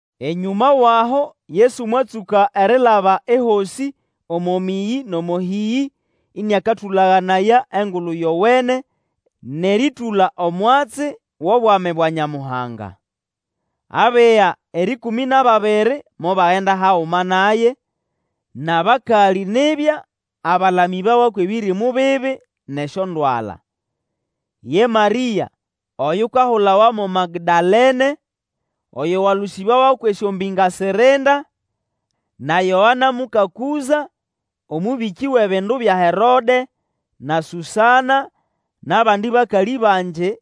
Enyũma wʼaho Yesu mwatsũka erilaba ehosĩ omo mĩyĩ nʼomo hĩyĩ, ĩnĩakatũlaganaya Engulu Yowene nʼerĩtũla omwatsi wʼobwami bwa Nyamuhanga. Abiga erĩkũmĩ nʼababiri mobagenda haguma naye, nʼabakalĩ nibya abalamĩbawa kwʼebĩrĩmũ bibi nʼesyondwala. Ye Marĩa oyukahulawa mo Magdalene, oyo walũsĩbawa kwʼesyombĩnga sirinda, na Yoana, muka Kũza, omũbĩkĩ wʼebindu bya Herode, na Susana, nʼabandi bakalĩ bangi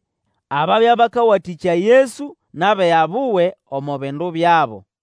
ababya bakawatĩkya Yesu nʼabiga buwe omo bindu byabo.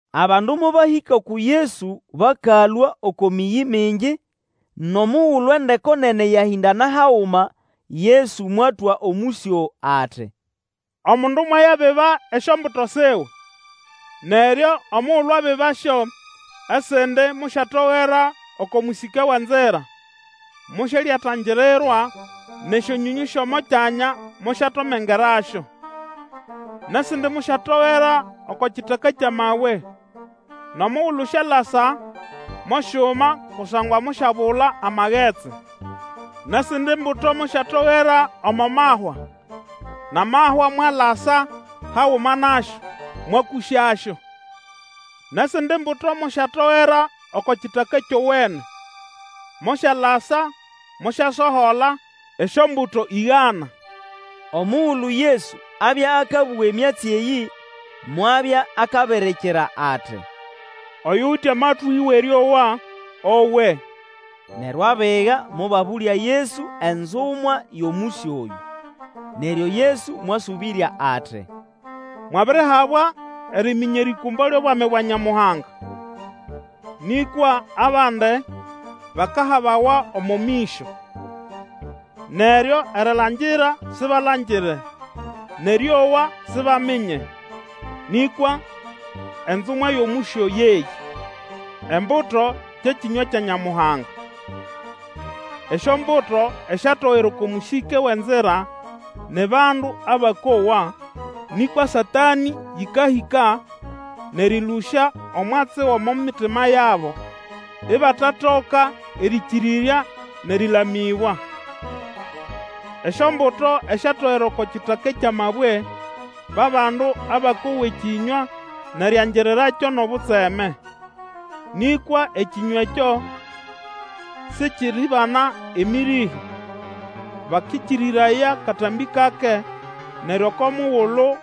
Abandu mobahĩka uku Yesu bakalũa oko mĩyĩ mingi; nʼomugulu endeko nene yahĩndana haguma, Yesu mwatwa omũsyo ati, Omundu mwayabiba esyombuto siwe. Neryo omugulu abibasyo esindi mosyatogera oko mũsĩke wʼenzira; mosyalyatangirirwa, nʼesyonyonyũ syʼomo kyanya mosyatomengerasyo. Nʼesindi mosyatogera oko kitaka kyʼamabwe, nʼomugulu syalasa mosyuma kusangwa mosyabula amagetsi. Nʼesindi mbuto mosyatogera omo mahwa; nʼamahwa mwatasa haguma nasyo, mwakũsyasyo. Nʼesindi mbuto mosyatogera oko kitaka kyowene, Mosyalasa, mosyasohola esyombuto ĩgana. Omugulu Yesu abya akabũga emyatsi eyĩ, mwabya akabirikira ati, Oyuwite amatwĩ wʼerĩowa, owe! Neryo abiga mobabũlya Yesu enzumwa yʼomũsyo oyũ. Neryo Yesu mwasũbĩrya ati, Mwabirihabwa eriminya erĩkũmbo lyʼobwami bwa Nyamuhanga; nĩkwa abandi bakahabawa omo mĩsyo: neryo erilangira sibalangire, nʼerĩowa, sibaminye. Nĩkwa enzumwa yʼomũsyo yeyĩ: embuto kye kĩnywa kya Nyamuhanga. Esyombuto esyatogera oko mũsĩke wʼenzira ni bandu abakowa; nĩkwa Satanĩ yĩkahĩka nʼerĩlũsya omwatsi gʼomo mitima yabo, ibatatoka erĩkĩrĩrya nʼerĩlamĩbwa. Esyombuto esyatogera oko kitaka kyʼamabwe ba bandu abakowa ekĩnywa nʼeriangirirakyo nʼobutseme. Nĩkwa ekĩnywa ekyo sikiribana emĩrĩhĩ; bakĩkĩrĩraya katambĩ kake, neryo oko mugulu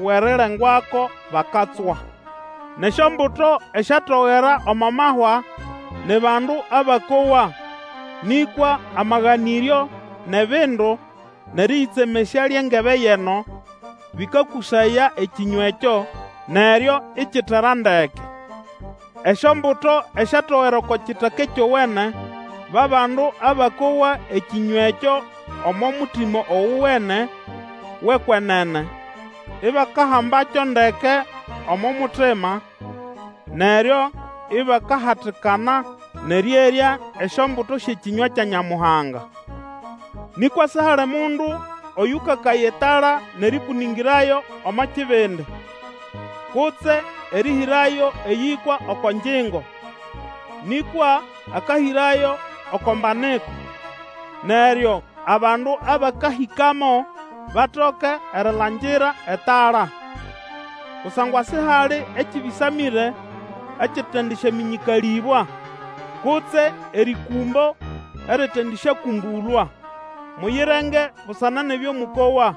wʼerirengwako, bakatswa. Nʼesyombuto esyatogera omo mahwa ni bandu abakowa; nĩkwa amaganĩryo nʼebindu nʼerĩyĩtsemesya lyʼengebe yʼeno, bĩkakũsaya ekĩnywa ekyo, neryo ikitera ndeke. Esyombuto esyatogera oko kitaka kyowene ba bandu abakowa ekĩnywa ekyo omo mutima ogowene wʼekwenene, ibakahambakyo ndeke omo mutima, neryo ibakahatikana, nʼerĩerya esyombuto syʼekĩnywa kya Nyamuhanga. Nĩkwa sihali mundu oyũkakaya etala nʼerĩkũnĩngĩrayo omo kibindi, kutse erĩhĩrayo eyĩkwa oko ngyingo, nĩkwa akahĩrayo oko mbaniko, neryo abandu abakahĩkamo batoke erilangira etala. Kusangwa sihali ekĩbĩsamĩre ekitendisyamĩnyĩkalĩbwa, kutse erĩkũmbo eritendisyakũmbũlwa. Muyirenge busana nʼebyo mũkowa!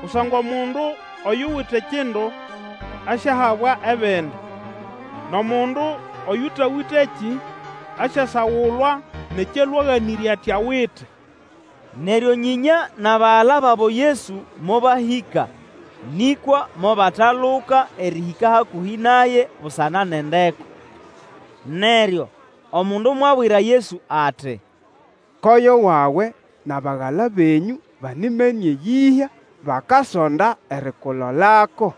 Kusangwa omundu oyuwite kindu, asyahabwa ebindi, nʼomundu oyutawitekĩ asyasagulwa nʼekyo alwe aganĩrye ati awite. Neryo nyĩnya nʼabagala babo Yesu mobahĩka, nĩkwa mobataluka erĩhĩka hakũhĩ naye busana nʼendeko. Neryo omundu mwabwira Yesu ati, Koyo wawe nʼabagala benyũ banimene eyĩhya, bakasonda erikulolako.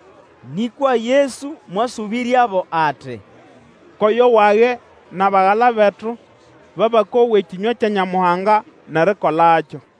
Nĩkwa Yesu mwasũbĩryabo ati, Koyo wage, nʼabagala betu ba bakowa ekĩnywa kya Nyamuhanga, nʼerikolakyo.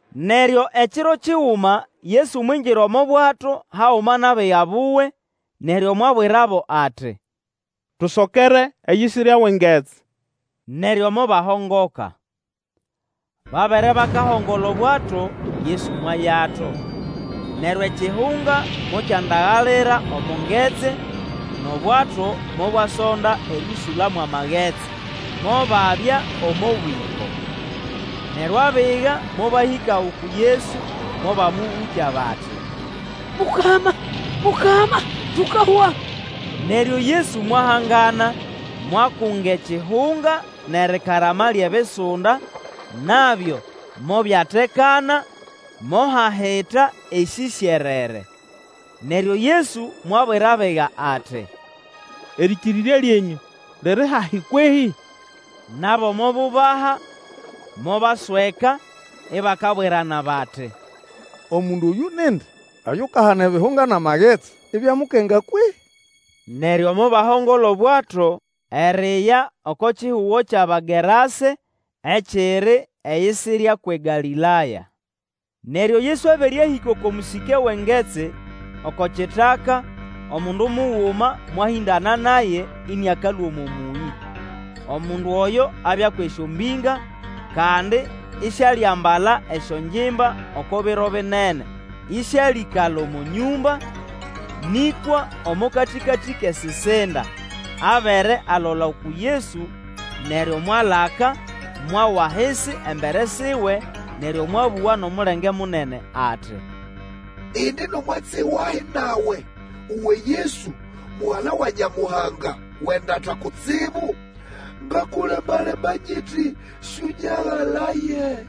Neryo ekiro kiguma Yesu mwingira omo bwato haguma nʼabiga buwe, neryo mwabwirabo ati, Tusokere eyisirya wʼengetsi. Neryo mobahongoka. Babere bakahongola obwato, Yesu mwayato. Neryo ekihunga mokyandagalira omo ngetsi, nʼobwato mobwasonda erĩũsũla mwʼamagetsi, mobabya omo bwĩko. Neryo abiga mobahĩka uku Yesu, mobamũbũkya bati, Mukama, Mukama, tukahwa! Neryo Yesu mwahangana, mwakunga ekihunga, nʼerikarama lyʼebisunda, nabyo mobyatekana mohahita esĩsyerere. Neryo Yesu mwabwira abiga ati, Erĩkĩrĩrya lyenyũ liri hahi kwehĩ? Nabo mobubaha, mobasweka, ibakabwirana bati, Omundu oyũ nindi Oyukahana ebihunga nʼamagetsi, ibyamukenga kwehĩ? Neryo mobahongola obwato eriya oko kihugo kyʼAbagerase ekiri eyisirya kwʼeGalĩlaya. Neryo Yesu abere ahĩka oko mũsĩke wʼengetsi oko kitaka, omundu muguma mwahĩndana naye ĩnĩakalũa omo mũyĩ. Omundu oyo abya kwʼesyombinga, kandi isialiambala esyongimba oko biro binene, ĩsĩalĩkala omo nyũmba, nĩkwa omo katĩkatĩ kʼesisinda, Abere alola uku Yesu, neryo mwalaka, mwawa ahisi embere siwe, neryo mwabũga nʼomulenge munene ati, indi nʼomwatsi wahi nawe, uwe Yesu, Mugala wa Nyamuhanga Wʼendata Kutsibu, ngakulemba-lemba nyiti sũnyagalaye.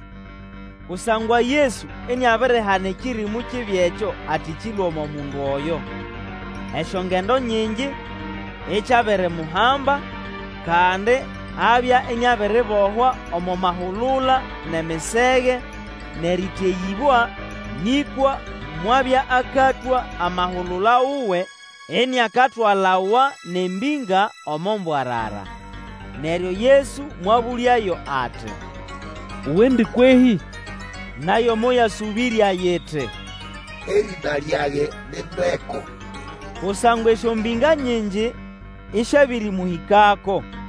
Kusangwa Yesu iniabirihana ekĩrĩmũ kibi ekyo ati kĩlũe omo mundu oyo. Esyongendo nyingi ikyabirimuhamba; kandi abya iniabiribohwa omo mahulula nʼemisege, nʼerĩteyĩbwa, nĩkwa mwabya akatwa amahulula wuwe iniakatwalawa nʼembĩnga omo mbwarara. Neryo Yesu mwabũlyayo ati, Uwendi kwehĩ? Nayo moyasũbĩrya yiti, Erĩna lyage ni ndeko, kusangwa esyombĩnga nyingi isyabirimũhĩkako.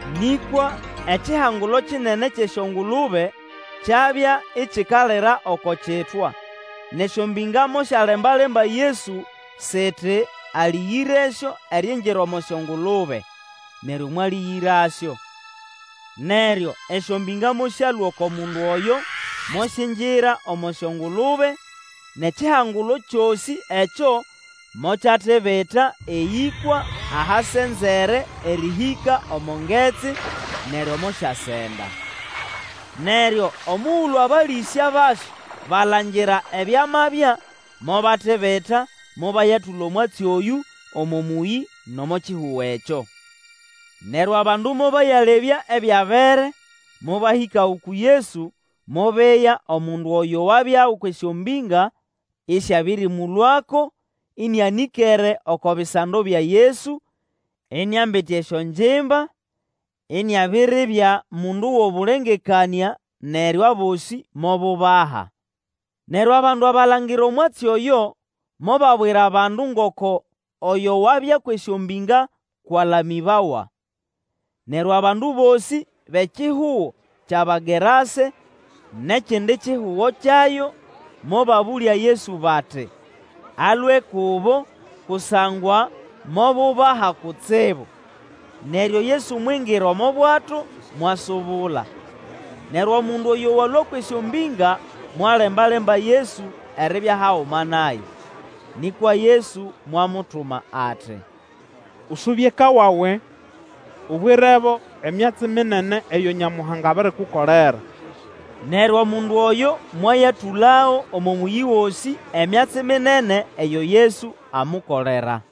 Nĩkwa ekihangulo kinene kyʼesyongulube kyabya ikikalira oko kitwa, nʼesyombĩnga mosyalemba-lemba Yesu siti alĩgĩresyo eriingira omo syongulube. Neryo mwalĩgĩrasyo. Neryo esyombĩnga mosyalũa oko mundu oyo, mosyingira omo syongulube; nʼekihangulo kyosĩ ekyo mokyatibita eyĩkwa ahasenzere erĩhĩka omo ngetsi, neryo mosyasenda. Neryo omugulu abalĩsya basyo balangira ebyamabya, mobatibita mobayatũla omwatsi oyũ omo mũyĩ nʼomo kihugo ekyo. Neryo abandu mobayalebya ebyabere; mobahĩka uku Yesu, mobeya omundu oyo wabya kwʼesyombĩnga ĩsyabĩrĩmũlũako ĩnĩanĩkere oko bisando bya Yesu, iniambite esyongimba, iniabiribya mundu wʼobũlengekanĩa, neryo abosĩ mobubaha. Neryo abandu abalangira omwatsi oyo, mobabwira abandu ngoko oyo wabya kwʼesyombĩnga kwʼalamĩbawa. Neryo abandu bosĩ bʼekihugo kyʼAbagerase nʼekindi kihugo kyayo, mobabũlya Yesu bati alũe kubo, kusangwa mobubaha kutsibu. Neryo Yesu mwingira omo bwato, mwasubula. Neryo omundu oyo walũa kwʼesyombĩnga mwalemba-lemba Yesu eribya haguma naye. Nĩkwa Yesu mwamutuma ati, Usube eka wawe, ubwirebo emyatsi minene eyo Nyamuhanga abirikukolera. Neryo omundu oyo mwayatũlago omo mũyĩ gosĩ emyatsi minene eyo Yesu amukolera.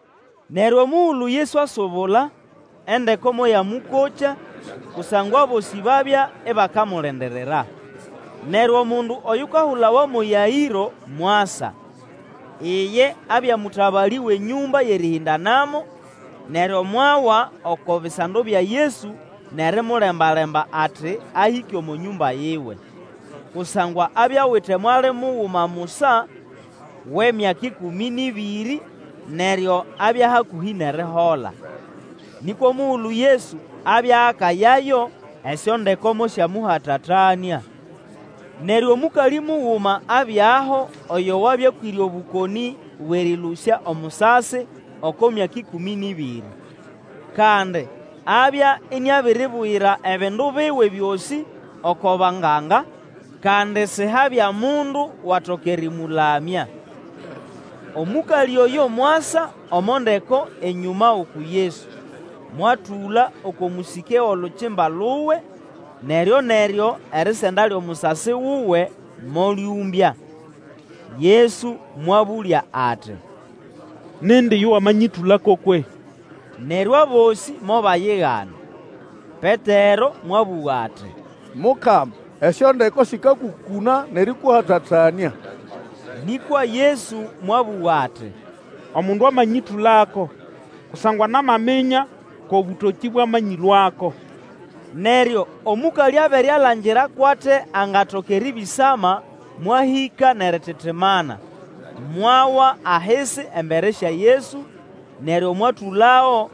Neryo omugulu Yesu asubula, endeko moyamũkokya, kusangwa abosĩ babya ibakamulindirira. Neryo omundu oyukahulawa mo Yaĩro mwasa. Iye abya mũtabalĩ wʼenyũmba yʼerĩhĩndanamo, neryo mwawa oko bisando bya Yesu nʼerimulemba-lemba ati ahĩke omo nyũmba yiwe. Kusangwa abya awite mwali muguma musa, wʼemyaka ĩkũmĩ nʼĩbĩrĩ, neryo abya hakũhĩ nʼerihola. Nĩkwa omugulu Yesu abya akayayo, esyondeko mosyamũhatatanĩa. Neryo omũkalĩ muguma abyaho oyo wabya akwĩre obũkonĩ bwʼerĩlũsya omusasi oko myaka ĩkũmĩ nʼĩbĩrĩ. Kandi abya iniabiribugira ebindu biwe byosĩ oko banganga, kandi sihabya mundu watoka erĩmũlamya. Omũkalĩ oyo mwasa omo ndeko enyũma uku Yesu, mwatũla oko mũsĩke wʼolukimba luwe, neryo-neryo erisenda lyʼomusasi wuwe molyũmbya. Yesu mwabũlya ati, Nindi yo wamanyĩtũlako kwehĩ? Neryo abosĩ mobayigana. Petero mwabũga ati, Mukama, esyondeko sĩkakũkũna nʼerĩkũhatatanĩa! Nĩkwa Yesu mwabũga ati, Omundu amanyĩtũlako, kusangwa namaminya kʼobũtokĩ bwamanyĩlũako. Neryo omũkalĩ abere alangira kwʼate angatoka erĩbĩsama, mwahĩka nʼerititimana, mwawa ahisi embere sya Yesu, neryo mwatũlago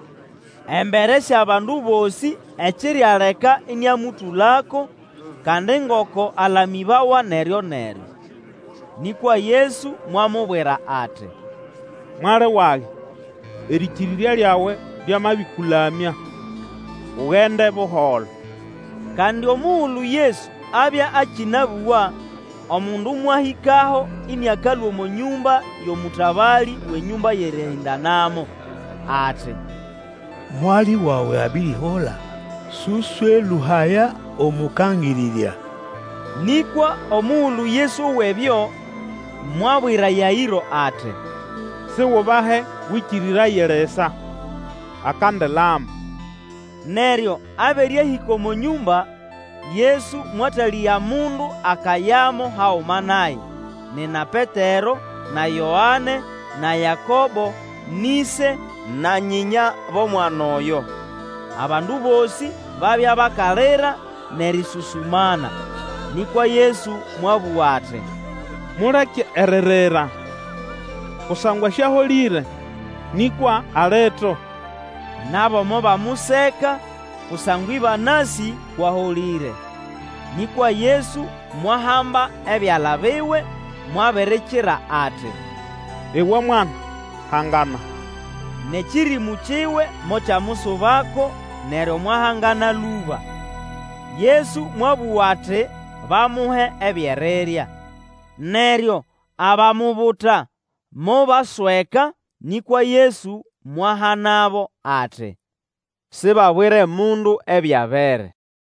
embere syʼabandu bosĩ ekirialeka ĩnĩamũtũlako, kandi ngoko alamĩbawa neryoneryo. Nĩkwa Yesu mwamubwira ati, Mwali wage, erĩkĩrĩrya lyawe lyamabĩkũlamya; ugende buholo. Kandi omugulu Yesu abya akĩnabũga, omundu mwahĩkaho ĩnĩakalũa omo nyũmba yʼomũtabalĩ wʼenyũmba yʼerĩhĩndanamo. Ati, Mwali wawe abirihola; sũswelũhaya Omũkangĩrĩrya. Nĩkwa omugulu Yesu owa ebyo, mwabwira Yaĩro ati, Sigubahe Wĩkĩrĩraye lisa. Akandilama. Neryo abere ahĩka omo nyũmba, Yesu mwatalĩga mundu akayamo haguma naye, nina Petero, na Yoane, na Yakobo, nʼĩse na nyĩnya bʼomwana oyo. Abandu bosĩ babya bakalira nʼerĩsũsũmana. Nĩkwa Yesu mwabũga ati, Muleke eririra, kusangwa sĩaholĩre, nĩkwa alito. Nabo mobamuseka, kusangwa ĩbanasĩ kwʼaholĩre. Nĩkwa Yesu mwahamba ebyala biwe, mwabirikira ati, Iwe mwana, hangana! Nʼekĩrĩmũ kiwe mokyamusubako, neryo mwahangana lũba. Yesu mwabũga ati bamuhe ebyʼerirya. Neryo abamubuta mobasweka; nĩkwa Yesu mwahanabo ati, Sibabwire mundu ebyabere.